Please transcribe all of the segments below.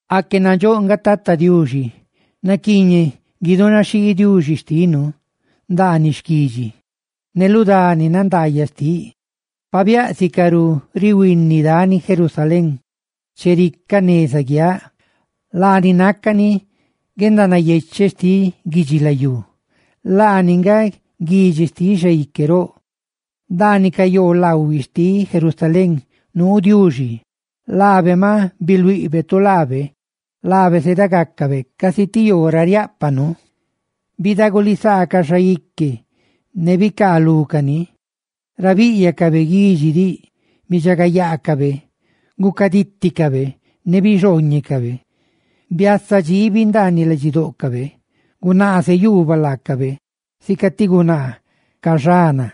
¡Aque nandxóꞌ nga Tata Diuxi! ¡Naquiiñeꞌ guidunaxhii Diuxi xtinu ndaaniꞌ xquidxi ne lu dani nandaayaꞌ xtiꞌ! ¡Pabiáꞌ sicarú rihuini dani Sión, chericaꞌ, neza guiaꞌ! ¡Laani nácani guendanayecheꞌ xtiꞌ guidxilayú! ¡Laani nga guidxi xtiꞌ Xaique roꞌ! Ndaaniꞌ ca yoolaꞌhuiꞌ xtiꞌ Jerusalén nuu Diuxi; laabe maꞌ biluiꞌbe tu laabe, laabe zedagacabe casi ti yoo ra riáꞌpanu. Bidagulisaa ca xaique ne bicaalúcani; ra bíꞌyacabe guidxi diꞌ, bidxagayaacabe, gucadíticabe ne bixhooñecabe. Biaaziꞌ dxiibi ndaaniꞌ ladxidóꞌcabe; gunaaze yuubaꞌ laacabe, sica ti gunaa caxana;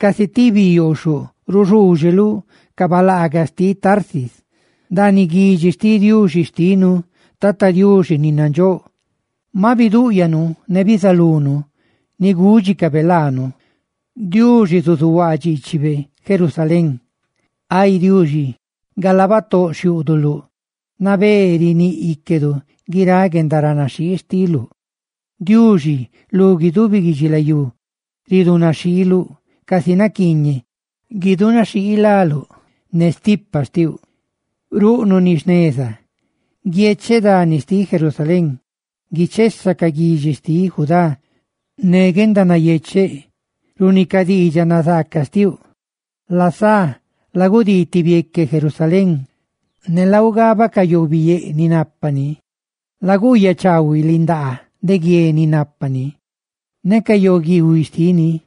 casi ti bi yooxhoꞌ ruxuuxeluꞌ ca balaagaꞌ xtiꞌ Tarsis. Ndaaniꞌ guidxi xtiꞌ Diuxi xtinu, Tata Diuxi ni nandxóꞌ, maꞌ bidúꞌyanu ne bizalunu ni gúdxicabe laanu: ¡Diuxi zuzuhuaa dxiichibe Jerusalén! Ay Diuxi, galaa batóꞌ xhiúꞌduluꞌ nabé riníꞌ íquedu guiráꞌ guendaranaxhii xtiluꞌ. Ay Diuxi, lu guidubi guidxilayú ridunaxhiiluꞌ casi naquiiñeꞌ gudunaxhii láluꞌ. Ne stipa xtiuꞌ ruꞌnuꞌ ni jneza. ¡Guiecheꞌ dani xtiꞌ Sión! ¡Guichesa ca guidxi xtiꞌ Judá ne guendanayecheꞌ runi ca diidxaꞌ nazaaca xtiuꞌ! Lasá lagudii ti bieque Sión, ne laugabaꞌ ca yoobiyéꞌa ni nápani; laguuyaꞌ chaahuiꞌ lindaaguié ni nápani, ne ca yoolaꞌhuiꞌ xtini,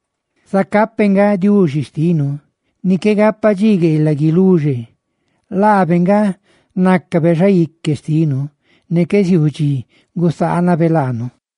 zacá peꞌ nga Diuxi xtinu ni qué gapa dxi gueelaꞌ guiluxe. ¡Laabe nga nácabe xaique xtinu ne qué ziuu dxi gusaanabe laanu!